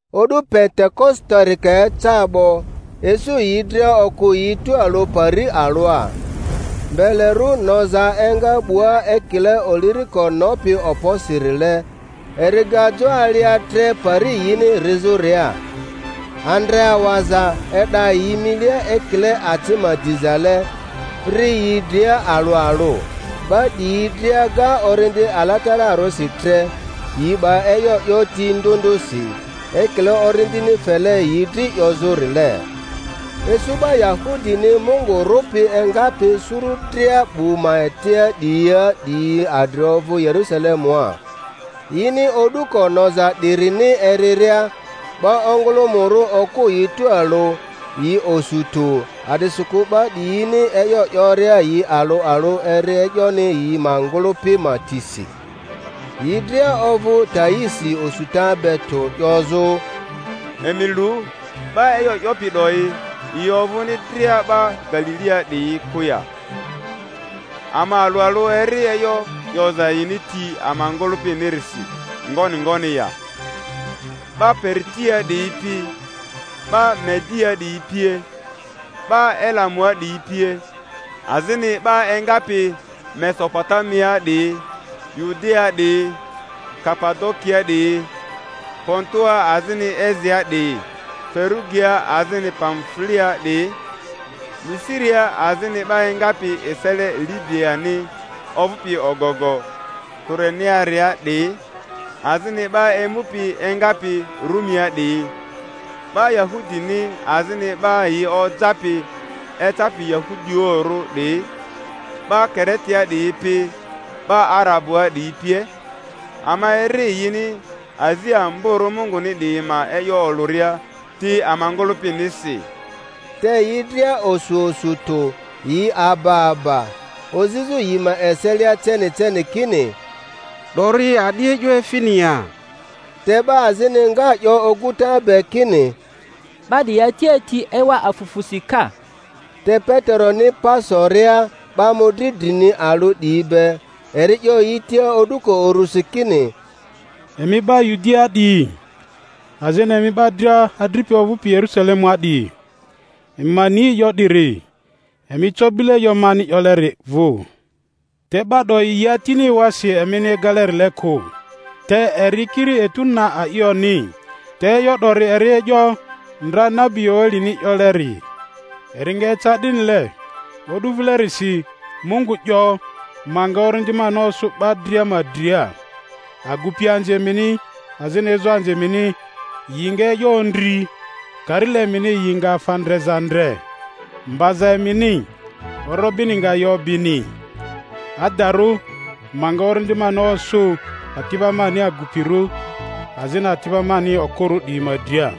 O'du Pentekositori ka eca 'bo, isu yi dria okᴜ yi tualᴜ pari alᴜa. Mbelerᴜ noza enga 'bua ekile oliriko nopi okposirile, eri ga jo alia tre pari yini rizᴜria. Andre awaza e'da yi milia ekile aci ma dizale, ri yi dria alᴜ alᴜ. 'Ba 'diyi dria ga Orindi Alatararᴜsi tre, yi 'ba e'yo 'yo ti ndᴜ ndᴜsi, ekile Orindini fele yi dri 'yozᴜrile. Isu 'ba Yahudini Mungu rᴜpi engapi suru dria 'bu ma etia 'diyia 'diyi adri ovᴜ Yerusalemua. Yini o'duko noza 'dirini eriria, 'ba ongᴜlᴜmᴜrᴜ okᴜ yi tualᴜ, yi osu tᴜ a'disikᴜ 'ba 'diyini e'yo 'yoria yi alᴜ alᴜ eri e'yoni yi ma ngᴜlᴜpi ma tisi. Yi dria ovᴜ taisi osuta be tᴜ, 'yozᴜ, Emi lu, 'ba e'yo 'yopi 'doyi yi ovᴜni dria 'ba Galilia 'diyi'i kᴜ ya? Ama alᴜ alᴜ eri e'yo 'yoza yini ti ama ngᴜlᴜpinirisi ngoni ngoni ya? 'Ba Paritia 'diyi pi 'ba Mediaa 'diyi pie, 'ba Elamua 'diyi pie, azini 'ba engapi Mesopotamiaa 'diyi, Yudiaa 'diyi, Kapadokiaa 'diyi, Pontoa azini Asiaa 'diyi, Ferugiaa azini Pamfuliaa 'diyi, Misiria azini 'ba engapi esele Libiani ovᴜpi ogogo Kurenearia 'diyi, azini 'ba emupi engapi Rumia 'diyi, 'ba Yahudini azini 'ba yi ojapi ecapi Yahudioᴜrᴜ 'diyi, 'ba Kiretea 'diyi pi 'ba Arabuaa 'diyi pie, ama eri yini azi amborᴜ Munguni 'diyi ma e'yo olᴜria ti ama ngᴜlᴜpinisi. Te yi dria osu osu tᴜ, yi aba aba, ozizᴜ yi ma eselia ceni ceni kini, 'Dori a'di e'yo efini ya? Te 'ba azini nga 'yo oguta be kini, 'Ba 'diyi ati ati ewa afufusi ka! Te Peteroni pa soria 'ba mᴜdri drini alᴜ 'diyi be, eri 'yo yi tia o'duko urusi kini, Emi 'ba Yudiaa 'diyi, azini emi 'ba dria adripi ovᴜpi Yerusalemua 'diyi, emi ma ni 'eyo 'diri, emi co bile e'yo mani 'yoleri vᴜ. Te 'ba 'doyi yi atini ewasi emini egalerile kᴜ, te eri kiri etu na a'ioni; te e'yo 'dori eri e'yo ndra nabi Yoelini 'yoleri: Eri nga eca 'dinile o'du vilerisi, Mungu 'yo, ma nga Orindi mani osᴜ 'ba dria ma dria; agupianzi emini azini ezoanzi emini yi nga e'yo ondri, karile emini yi nga afa ndreza ndre, mbaza emini, orobini nga yi obini; adarᴜ, ma nga Orindi mani osᴜ ati'ba mani agupirᴜ azini ati'ba mani okᴜrᴜ 'diyi ma dria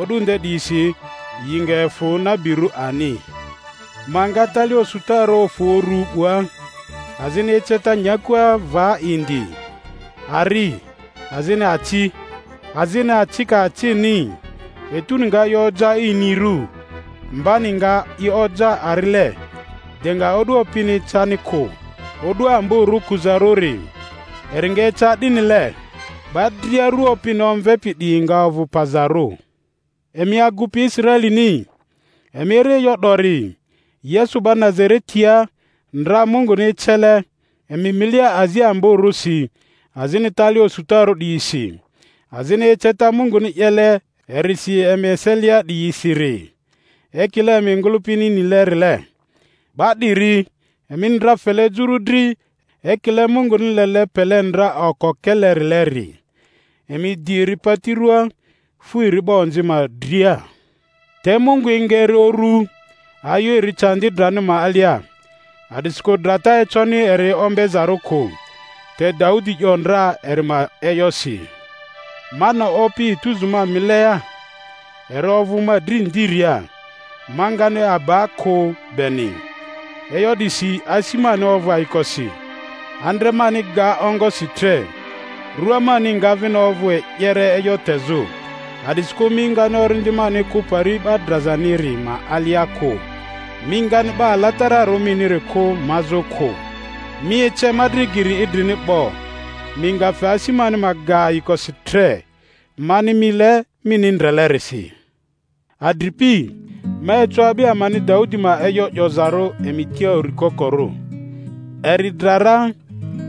o'du nde 'diyisi; yi nga efᴜ nabirᴜ ani. Ma nga tali osutarᴜ ofᴜ uru 'bua azini eceta nyakua va indi, ari, azini aci, azini acika acini; etuni nga i oja inirᴜ, mbani nga i oja arile, de nga o'du Opini ecani kᴜ, o'du amborᴜ kuzarᴜri. Eri nga eca 'dinile, 'ba dria ru Opini omvepi 'diyi nga ovᴜ pazarᴜ. Emi agupi Israelini, emi eri e'yo 'dori: Yesu 'ba Nazaretia, ndra Munguni ecele emi milia azi ambo-rᴜsi azini tali osutarᴜ 'diyisi, azini eceta Munguni 'yele erisi emi eselia 'diyisiri, ekile emi ngᴜlᴜpini nile-rile 'ba 'diri, emini ndra fele juru dri ekile Munguni lele pele ndra okokelerileri, emi di eri pati ruaa, fu eri 'ba onzi ma dria. Te Mungu enga eri uru, ayu eri candi drani ma alia, a'disikᴜ drata econi eri ombezarᴜ kᴜ. Te Daudi 'yo ndra eri ma e'yosi, Ma ne Opi etuzu ma milia, eri ovᴜ ma dri ndiria, ma ngani aba kᴜ beni; e'yo 'disi asi mani ovᴜ ayikosi, andre mani ga ongosi tre; rᴜa mani nga vini ovᴜ e'yere e'yo tezᴜ. A'disikᴜ mi ngani orindi mani kᴜ Pari 'ba drazaniri ma alia kᴜ, mi ngani 'Ba Alatararᴜ miniri kᴜ mazᴜ kᴜ. Mi ece ma dri geri idrini 'bo; mi nga fe asi mani ma ga ayikosi tre mani mile mini ndrelerisi. Adripi, ma eco a'bi amani Daudi ma e'yo 'yozarᴜ emi tia uri kokorᴜ; eri dra ra,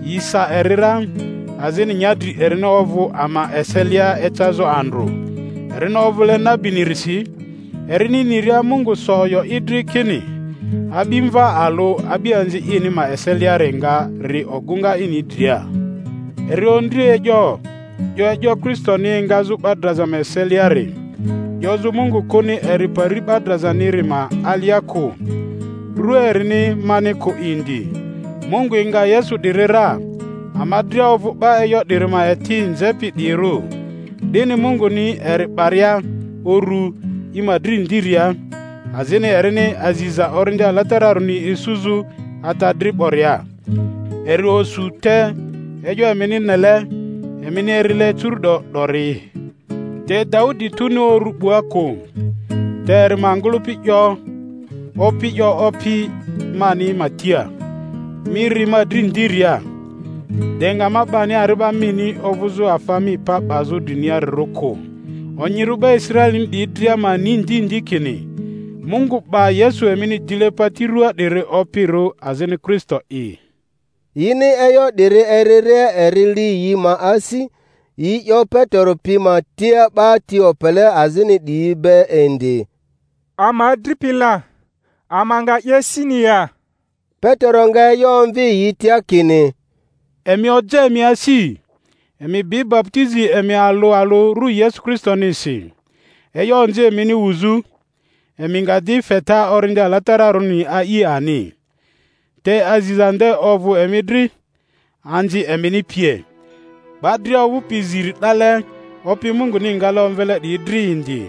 yi sa eri ra, azini nyadri erini ovᴜ ama eselia ecazᴜ andrᴜ. Erini ovᴜle nabinirisi, erini niria Mungu so oyo i dri kini a'bimva alᴜ a'bianzi ini ma eseliari nga ri ogᴜŋa ini dria, eri ondri e'yo, 'yo e'yo Kristoni engazu 'ba draza eseliari, 'yozᴜ Mungu kᴜni eri Pari 'ba drazaniri ma alia kᴜ, rua erini mani kᴜ indi. Mungu enga Yesu 'diri ra; ama dria ovᴜ 'ba e'yo 'diri ma eti nzepi 'diyirᴜ. 'Dini Munguni eri 'baria urᴜ i ma dri ndiria, azini erini aziza Orindi Alatararᴜni isuzᴜ Ata dri 'boria, eri osᴜ te e'yo emini nele, emini erile curu'do 'dori. Te Daudi tuni uru 'bua kᴜ; te eri ma ngᴜlᴜpi 'yo, Opi 'yo Opi mani ma tia, Mi ri ma dri ndiria, de nga ma 'bani ari'ba mini ovᴜzᴜ afa mi pa 'bazᴜ driniarirᴜ kᴜ. Onyirᴜ 'ba Israelini 'diyi dria ma ni ndi ndi kini Mungu 'ba Yesu emini dile pati ruaa 'diri Opirᴜ azini Kristo'i. Yini e'yo 'diri eriria eri li yi ma asi, yi 'yo Petero pi ma tia 'ba ti opele azini 'diyi be indi, Ama adripi la! ama nga 'ye sini ya? Petero nga e'yo omvi yi tia kini, Emi oja emi asi, emi bi baputizi emi alᴜ alᴜ rᴜ Yesu Kristonisi, e'yo onzi emini wuzᴜ; emi nga -di feta Orindi Alatararᴜni a'i ani. Te aziza nde ovᴜ emi dri, anzi emini pie, 'ba dria ovᴜpi ziri 'dale Opi Munguni ngale omvele 'diyi dri indi.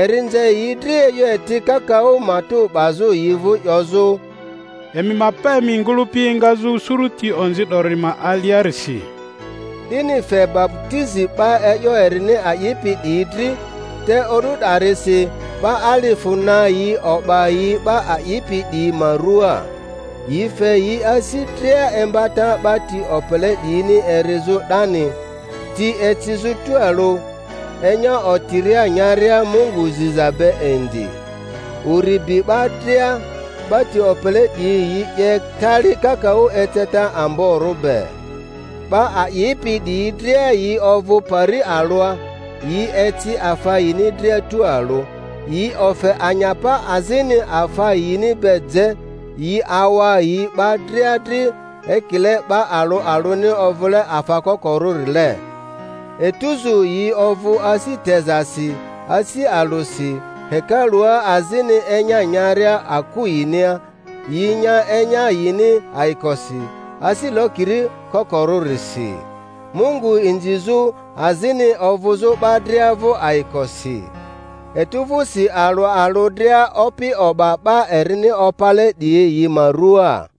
Eri nze yi dri e'yo eti kakaᴜ, matᴜ 'bazᴜ yi vᴜ 'yozᴜ, Emi ma pa emi ngᴜlᴜpi engazᴜ suruti onzi 'dori ma aliarisi. 'Dini fe baputizi 'ba e'yo erini a'ipi 'diyi dri, te o'du 'darisi 'ba alifᴜ na yi o'ba yi 'ba a'ipi 'diyi ma ruaa. Yi fe yi asi dria imbata 'ba ti opele 'diyini erizᴜ 'dani, ti ecizᴜ tualᴜ, enya otiria nyaria Mungu ziza be indi. Uri bi 'ba dria; 'ba ti opele 'diyi yi 'ye tali kakaᴜ eceta amborᴜ be. 'Ba a'ipi 'diyi dria yi ovᴜ pari alᴜa, yi eci afa yini dria tualᴜ; yi ofe anyapa azini afa yini be je, yi awa yi 'ba dria dri ekile 'ba alᴜ alᴜni ovᴜle afa kokorᴜrile. Etuzu yi ovᴜ asi tezasi asi alᴜsi, hekalua azini enya nyaria aku yinia, yi nya enya yini ayikosi asi lokiri kokorᴜrisi, Mungu inzizᴜ azini ovᴜzᴜ 'ba dria vᴜ ayikosi. Etu vᴜsi alᴜ alᴜ dria Opi o'ba 'ba erini opale 'diyi yi ma rᴜaa.